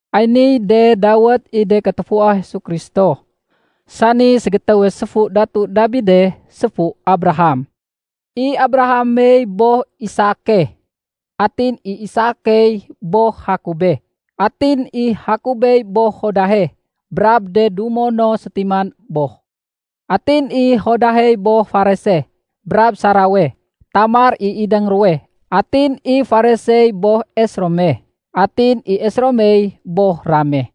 Ay niy de dawét i de katufua Jesu Kristo, sani ségétéwe séfu Datu Dabide séfu Abraham. I Abrahamey boh Isake. Atin i Isakey boh Jakobe. Atin i Jakobey boh Judahe brab de dumo no sétiman boh. Atin i Judahey boh Farese brab Sarawe. (Tamar i idéng ruwe.) Atin i Faresey boh Esrome. Atin i Esromey boh Rame.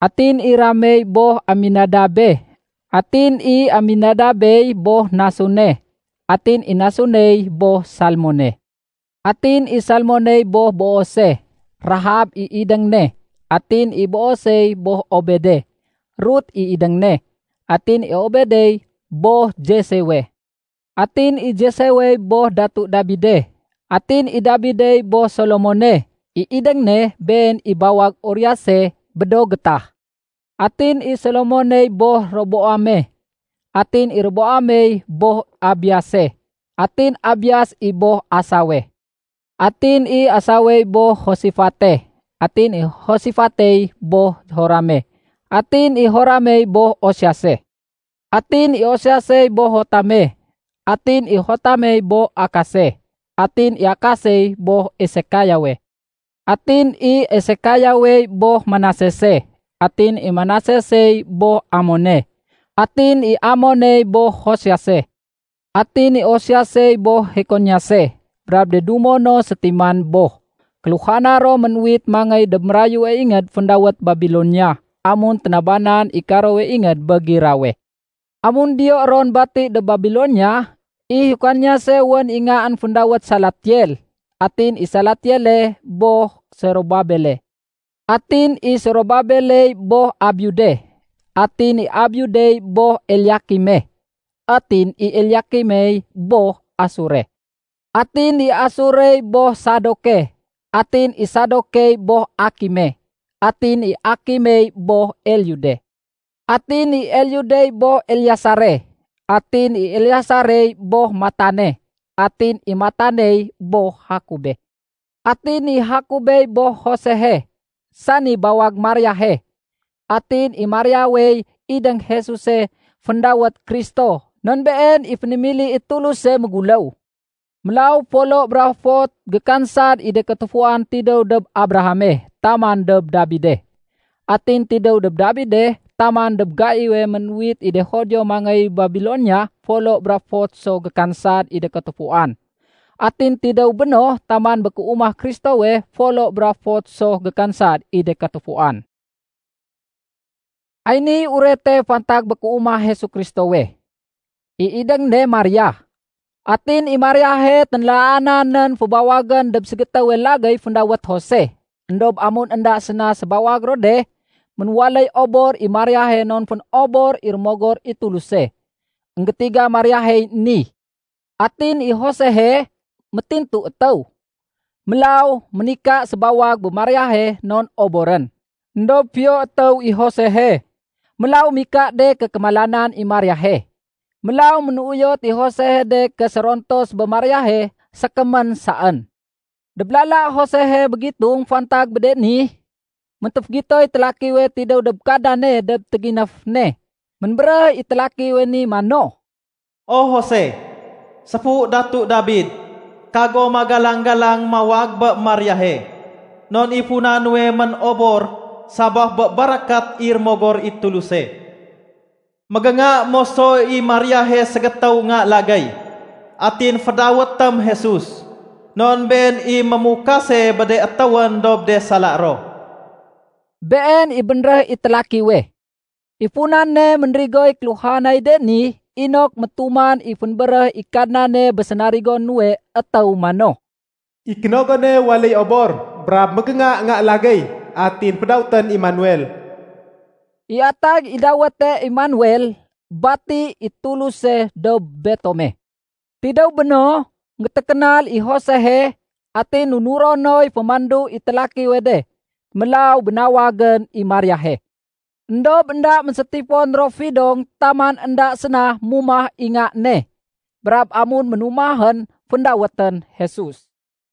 Atin i Ramey boh Aminadabe. Atin i Aminadabey boh Nasone. Atin i Nasoney boh Salmone. Atin i Salmoney boh Boose. (Rahab i idéng ne.) Atin i Boosey boh Obede. (Rut i idéng ne.) Atin i Obedey boh Jesewe. Atin i Jesewey boh Datu Dabide. Atin i Dabidey boh Solomone. (I idéng ne been i bawag Uriase bé do gétah.) Atin i Solomoney boh Roboame. Atin i Roboamey boh Abiase. Atin Abias i boh Asawe. Atin i Asawey boh Josefate. Atin i Josefatey boh Jorame. Atin i Joramey boh Osiase. Atin i Osiasey boh Jotame. Atin i Jotamey boh Akase. Atin i Akasey boh Esekayawe. Atin i Esekayawey boh Manasese. Atin i Manasesey boh Amone. Atin i Amoney boh Josiase. Atin i Josiasey boh Jekoniase brab de dumo no sétiman boh. Kéluhana ro mén-uwit mangéy dob mérayue ingéd féndawét Babilonia amun ténabanan i karowe ingéd bé girawe. Amun diyo ron bati dob Babilonia, i Jekoniase wén i ngaén féndawét Salatiel. Atin i Salatieley boh Sorobabele. Atin i Sorobabeley boh Abiude. Atin i Abiudey boh Eliakime. Atin i Eliakimey boh Asore. Atin i Asorey boh Sadoke. Atin i Sadokey boh Akime. Atin i Akimey boh Eliude. Atin i Eliudey boh Eleasare. Atin i Eleasarey boh Matane. Atin i Mataney boh Jakobe. Atin i Jakobey boh Josehe, sani bawag Mariahe. Atin i Mariawey idéng Jesuse féndawét Kristo non Been i fénémili i Tuluse méguléw. Mélaw folo bra fot gékansad i de katufuan tidéw dob Abrahame taman dob Dabide. Atin tidéw dob Dabide taman dob gaiwe mén-uwit i de Judio mangéy Babilonia folo bra fot so gékansad i de katufuan. Atin tidéw béno taman bé kéumah Kristowe folo bra fot so gékansad i de katufuan. Ay ni urete fantag bé kéumah Jesu Kristowe. I idéng ne Maria. Atin i Mariahe ténlaana nén fébawagén dob ségétéwe lagéy féndawét Jose. Endob amun énda séna sébawag ro de, ménwaléy obor i Mariahe non fénobor i Rémogor i Tuluse. Enggétiga Mariahey ni. Atin i Josehe, métintu étéw, mélaw ménika sébawag bé Mariahe non oborén. Endob fiyo étéw i Josehe, mélaw mika de ké kémalanan i Mariahe. Mélaw ménuyot i Josehe de ké sérontos bé Mariahe sékémén saén. Dob lala Josehe mégitung fantag bé de ni, méntéfégitoy télakiwe tidéw dob Kadnane dob téginéf ne. Ménbéréh i télakiwe ni mano, “O Jose, séfu Datu Dabid, kago magalang-galang mawag bé Mariahe, non i funa nuwe mén-obor sabaf bé barakat i Rémogor i Tuluse. Mégénga moso i Mariahe ségétéw nga lagéy. Atin fédawétém Jesus, non Been i mémukase bé de étéwén dob de sala ro.” Been i bénréh i télakiwe. I funane ménrigoy kéluhanay de ni inok métuman i fénbéréh i Kadnane bé sénarigo nuwe étéw mano, “I kénogone waléy obor, brab mégénga nga lagéy, atin fédawétén Emanuel.” (I atag i dawéte Emanuel “Bati i Tuluse dob betome.”) Tidéw béno, énggétékénal i Josehe, atin nunuro noy fémandu i télakiwe de, mélaw bénawagén i Mariahe. Endob énda ménsétifon ro fidong taman énda séna mumah i nga ne. Brab amun ménumahén, féndawétén Jesus.